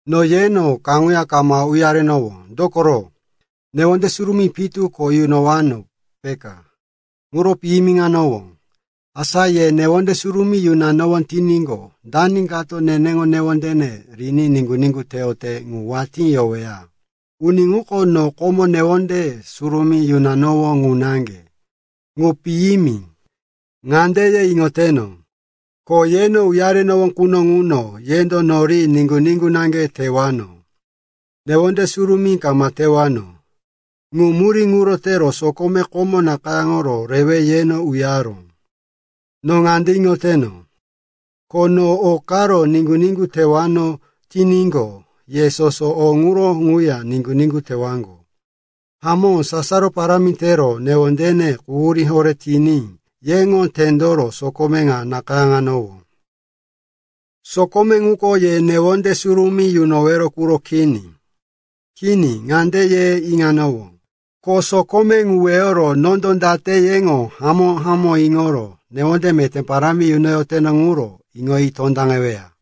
No yeno kaŋuya kama uyarenowó, dokoro, newonde surumí pitu ko yunowano, peka. Ŋuro piyimiŋanowó. Asa ye newonde surumí yunowano tiníqo, dani kato neneŋo newondene riní niŋgu-niŋgu teyote ŋu watí yoweya? Uni ŋuko no komo newonde surumí yunanowó ŋu naŋge. Ŋu piyimi. Ŋande ye iŋoteno, ko yeno uyarewano quno ŋuno yendo nori niŋgu-niŋgu naŋge tewano, newonde surumí kama tewano. Ŋu murí ŋuro tero sokome komo nakayáŋoro rewe yeno uyaró. No ŋande iŋoteno, ko no o karo niŋgu-niŋgu tewano tiníqo, ye soso o ŋuro ŋuya niŋgu-niŋgu tewaŋgo. Hamó, sasaro parámi tero newondene quhurí horé tiní yeŋo tendoro sokome ŋu nakayáŋanowó. Sokome ŋuko ye newonde surumí yunowero quro kini. Kini, ŋande ye iŋanowó, ko sokome ŋu weyoro nondo date yeŋo hamó-hamó iŋoro newonde meté parámi yunoyoteno ŋuro iŋoyi tondaŋeweya.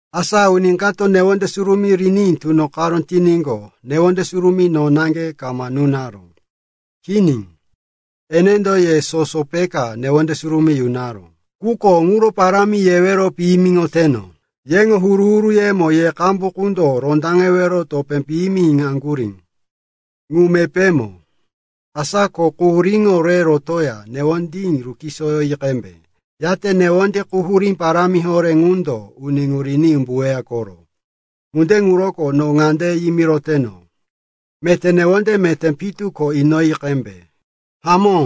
Asa uni kato newonde surumí riní tunoqaró tiníqo, newonde surumí no naŋge kama nunaró. Kini, enendo ye soso peka newonde surumí yunaró, quko ŋuro parámi yewero piyimiŋoteno. Yeŋo huru-huruyemo ye qambu qundo rondaŋero topé piyimi inaŋgurí. Ŋu mepémo. Asa ko quhuríŋo re rotoya newondí rukisoyi qembe. Yate newonde quhurí parámi horé ŋundo uni ŋu riní umbuweya koro. Ŋunde ŋuroko no ŋande yimiroteno, meté newonde meté pitu ko inoyi qembe. Hamó,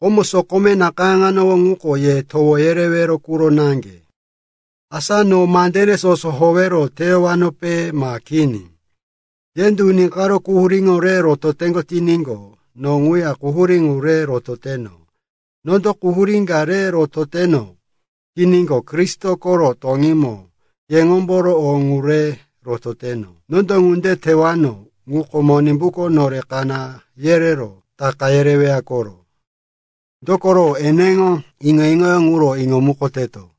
komo sokome nakayáŋanowó ŋuko ye towo yerewero quro naŋge, asa no mandene soso howero teyowaŋgope, ma kini? Yendo uni karo quhuríŋo re rototeŋgo tiníqo, no ŋuya quhurí ŋu re rototeno. Nondo quhurí ka re rototeno tiníqo, Kristo koro toŋímo yeŋomboro o ŋu re rototeno. Nondo ŋunde tewano ŋuko Monimbuko nore kaná yerero taka yereweya koro. Dokoro eneŋo iŋo-iŋoyó ŋuro iŋomukoteto.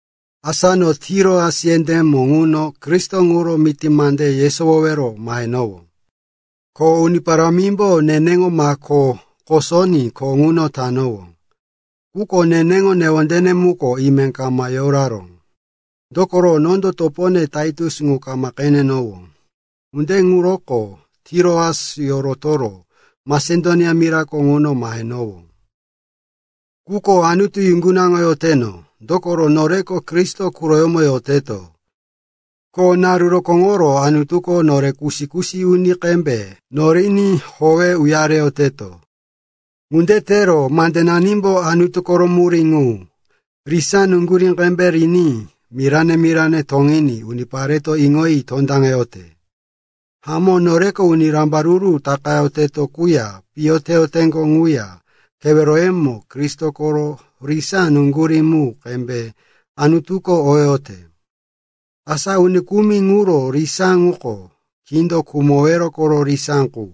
Asa no Tiroas yendémo ŋuno Kristo ŋuro miti mande yesowowero mahenowó, ko Uni Parámimbo neneŋo mako kosoní kho ŋu tanowó. Quko neneŋo newondene muko ime kama yoraró. Dokoro nondo topone Taitus ŋu kama qenenowó. Ŋunde ŋuroko Tiroas yorotoro Masedonia mirako ŋuno mahenowó. Quko Anutu yuŋgunaŋoyoteno, dokoro noreko Kristo quroyómo yoteto, ko naru rokóŋoro Anutuko nore kusi-kusi uni qembe noriní howe uyareyoteto. Ŋunde tero mandenanimbo Anutu koro murí ŋu, risá nuŋgurí qembe riní mirane-mirane toŋiní unipareto iŋoyi tondaŋeyote. Hamó, noreko uni rambaruru takayoteŋgo quya piyo teyoteŋgo quya keweroyemo Kristo koro risá nuŋgurí mu qembe Anutuko oyote. Asa uni kumi ŋuro risá ŋuko kindo khumowero koro risá qu.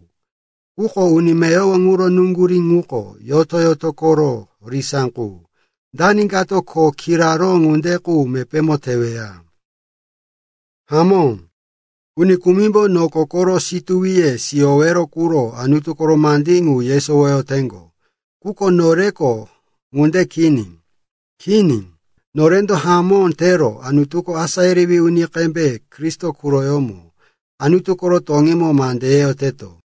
Quko uni meyowo ŋuro nuŋgurí ŋuko yoto-yoto koro risá qu. Dani kato kho kiraró ŋunde qu mepémo teweya? Hamó, uni kumimbo noko koro situwiye siyowero quro Anutu koro mandí ŋu yesowoyoteŋgo. Quko noreko ŋunde kini. Kini, norendo hamó tero Anutuko asá yerewí uni qembe Kristo quroyómo Anutu koro toŋímo mande yeyoteto.